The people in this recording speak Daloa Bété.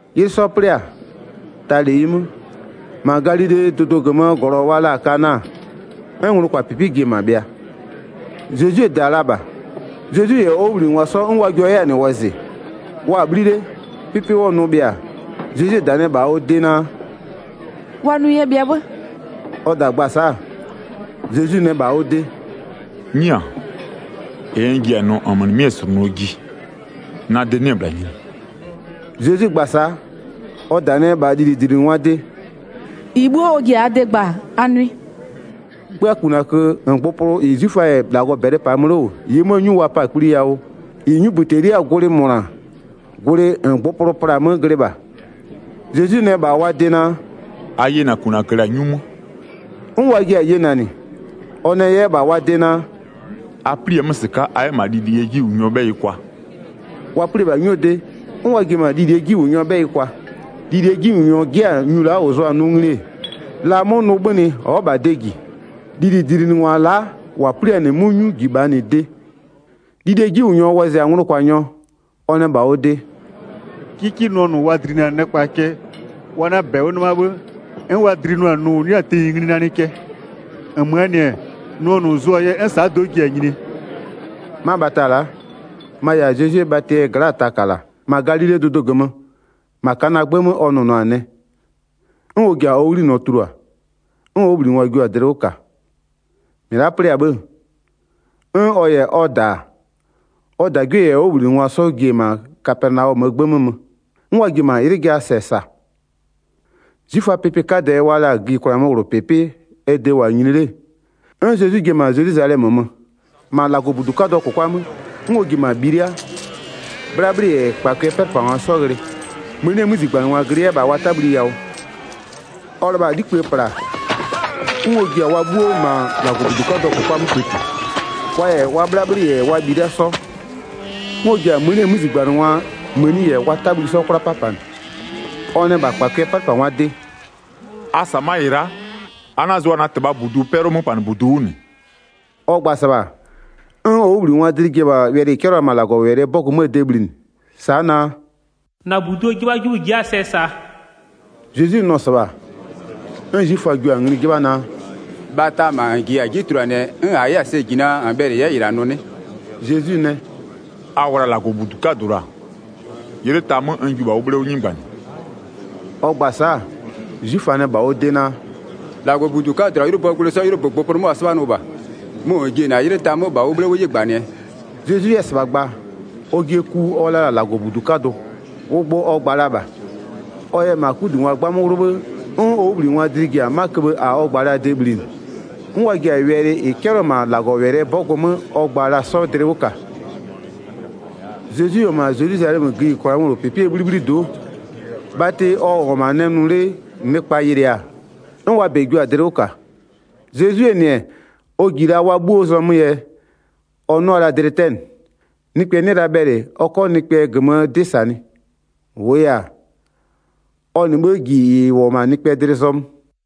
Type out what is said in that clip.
'Ylɩ 'sɔ 'plɩ-a, ta -leyi 'mö, -ma Galilee dʋdʋ -gömöö -glɔ wa la-a Kana 'n nglʋkwapɩpɩ ji-e -ma bhɩa, Zezwie -da-a la -bha. Zezwi -yɛ ɔ 'wʋbhlinɩngwa 'sɔ 'n wa jua 'yɛ-a -nɩ wɔzɩ. Wa-a 'bhli 'le, 'pɩpɩ 'wʋɔ nʋ bhɩa-a, Zezwie -da nɛ -bha ɔ de naa: “Wa nʋ yɛ bhɩa 'bhë.” Ɔ -da gba-a sa'a, Zezwi nɛ -bha ɔ de: “'Nyia, -ɩ n ji-a nʋɔ -nmö -nɩmɩ'ɩ-ɩ -slʋnʋɔ ji, na de 'nɩ-ɛ -bhla nyini.” Zezwi gba-a sa'a, ɔ -da nɛ -bha lilidlinɩngwaa de: “-Ɩ 'bhuo ɔ ji-a a de gbaa, a nʋɩ.” 'Kpöakunakö -ngbʋpʋlʋ -ɩ 'zwiföa -yɛ -Lagɔ -bɛlɩ 'paa mö 'le -wʋ, -ɩɩ 'möö 'nyu wa pa-a kpli yawʋ, -ɩ 'nyubïteliaa gwlɩ -mʋna, gwlɩ -ngbʋpʋlʋ pla-a 'mö glɩ -bha. Zezwi nɛ -bha wa de naa: “A yena -kunakö -la 'nyu 'mö.” 'N wa jiɩ-a yenanɩ. Ɔ nɛ 'yɛ -bha wa de naa: “A 'pli-a 'mö -sɩka'a, a 'yɛ -ma lilie 'jiwʋnyɔɔ 'bhɛyɩ kwa.” Wa 'pli-e -bha 'nyuo de, 'n wa ji-e -ma lilie 'jiwʋnyɔɔ 'bhɛyɩ kwa. Lilie 'jiwʋnyɔ 'jɩ-a nyu la'a -ʋ zʋ-a nʋ ngli-e, la 'mʋ nʋ 'bhönɩ ɔ'ɔ -bha de -ji, lilidlinɩngwa la'a -wa 'pli-a -nɩ 'mʋ 'nyu -ji -bha -nɩ de. Lilie 'jiwʋnyɔ wɔzɩ-a nglʋkwanyɔ, ɔ nɛ -bha ɔ de: “'Kɩkɩ nʋɔ -nʋ wa dlinɩ-a nɩkpa cɛ wa 'na -bɛ 'wʋ 'nɩma 'bhë, 'n wa dlinʋa-a nʋ -ʋ 'nɩ-a tenyi ngli nanɩ cɛ. -Nmöö -nɩ-ɛ, nʋɔ -nʋ -n zʋ-a yɛ 'n sa'a do'o ji-a nyinie?” 'Ma bhata la'a, ma-a -yɛ-a Zezwie bhatɩ gla'aa taka -la. -Ma Galilee dʋdʋ -gömö, -ma Kanaa 'gbë 'mö ɔ nʋnʋa-a nɛ, 'n ɔ ji-a ɔ 'ghlinɔ tulua, 'n ɔ 'wʋbhlinɩngwa jio-a dlɩ 'wʋ -ka. 12-Mɩ la'a 'plɩ-a 'bhë, 'n ɔ -yɛ ɔ -da-a, ɔ -dagwie -yɛ ɔ 'wʋbhlinɩngwa 'sɔ ji-e -ma Kapɛnaɔmöö 'gbë 'mö mö, 'n wa ji-e -ma 'ylɩ jaa -sɛ -sa. 'Zwiföaa pɩpɩ 'kadɛ wa la-a gïyikwlaa 'möwlʋpɩpɩ ɛ de -wʋ-a nyini 'le, 'n Zezwi ji-e -ma Zelwizalɛmö mö. 14-Ma -Lagɔbudu 'kadʋɔ -kʋkwa 'mö, 'n ɔ ji-e -ma bhilia-a, 'bhlabhlɩ -yɛ -kpakʋɩɛ 'pɛlʋpangwa 'sɔ ghlɩ, mënie 'mözigbanɩngwa glɩ 'yɛ -bha wa 'tabhli yawʋ. Ɔ lɩbha-a 'likpïë -pla-a, 'n ɔ ji-a wa 'bhuo -ma -Lagɔbudu 'kadʋɔ -kʋkwa 'mö kpëti, wa -yɛ wa 'bhlabhlɩ -yɛ wa bhilia 'sɔ, 'n ɔ ji-a mënie 'mözigbanɩngwaa mëni -yɛ wa 'tabhli 'sɔ 'kwla 'papanɩ. Ɔ nɛ -bha -kpakʋɩɛ 'pɛlʋpangwaa de: “A -sa ma'a -ɩ la'a, a 'na-a zʋa na -Tɩbhaa -budu 'pɛlʋɔ 'möpanɩbudu 'wʋ -nɩ.” Ɔ gba-a -sɩbha, 'n ɔ 'wʋbhlinɩngwaa dlɩ ji-a wɛlɩ -ɩ 'cɛlɩɔ la-a -ma -Lagɔwɛlɩɛ 'bɔgʋ 'möö de bhlinɩ, sa'a naa: “-Na -buduo 'jɩbhajɩbhʋ-ʋ ji'i-a sɛ -saa.” Zezwi nʋ-ɔ -sɩbha, 'n 'zwiföa jio-a ngli 'jɩbha naa: “Bhata -ma -n -jiya-a 'ji tuluanɩɛ 'n -a 'yɛ-a sɛ -ji naa -n bhɛlɩ -n 'yɛ -ɩ -la nʋ 'nɩ?” Zezwi nɛ: “A wla -Lagɔbudu 'kadʋ -la, 'ylɩ ta 'mö n jiʋ -bha ʋ 'bhle 'wʋ 'nɩgbanɩ.” Ɔ gba-a sa'a, 'zwiföa nɛ -bha ɔ de naa: “-Lagɔbudu 'kadʋ -la 'ylʋböö gwlɩ 'sɔ 'ylʋbö -ngbʋpʋlʋ 'mö wa 'sɩbhanʋ -bha, mʋ -n ji-e -na 'ylɩ ta 'mö -bha ʋ 'bhle 'wʋ 'nɩgbanɩɛ?” Zezwi 'yɛ-ɛ -sɩbha gba-a, ɔjɩɛ ku 'mʋ ɔ la-a -Lagɔbudu 'kadʋ, ʋ gbʋ ɔ gba la -bha. Ɔ yɛ -ma 'kudungwa 'gbamö 'wlʋ 'bhë, 'n ɔ 'wʋbhlinɩngwaa dlɩ ji-a 'ma köbhë -a ɔ gba la-aa de bhlinɩ, 'n wa ji-a wɛlɩ -ɩ 'cɛlɩɔ-ɔ -ma -Lagɔwɛlɩɛ 'bɔgʋ 'mö ɔ gba la-a 'sɔ dlɩ 'wʋ -ka. Zezwi -wʋ-ɔ -ma Zelwizalɛmö gïyikwlaa 'möwlʋpɩpɩɛ 'bhlibhlido'o, bhatɩ ɔ -wʋ-ɔ -ma nɛ nʋ 'le nɩkpa yɩlɩɩ-a, 'n wa -bɛ jio-a dlɩ 'wʋ -ka. Zezwie -nɩ, ɔ -ji la wa 'bhuoo zɔmöö yɛ, ɔ 'nʋa la dlɩ 'tɛnɩ. Nɩkpɛ 'nɩ la bhɛlɩ ɔ 'kɔ nɩkpɛɛ -gömöö 'dɩ -sanɩ, -wʋʋ yɛ-a, ɔ -nɩ 'bhë -ji -ɩ -wʋ-ɔ -ma nɩkpɛɛ dlɩ zɔmö.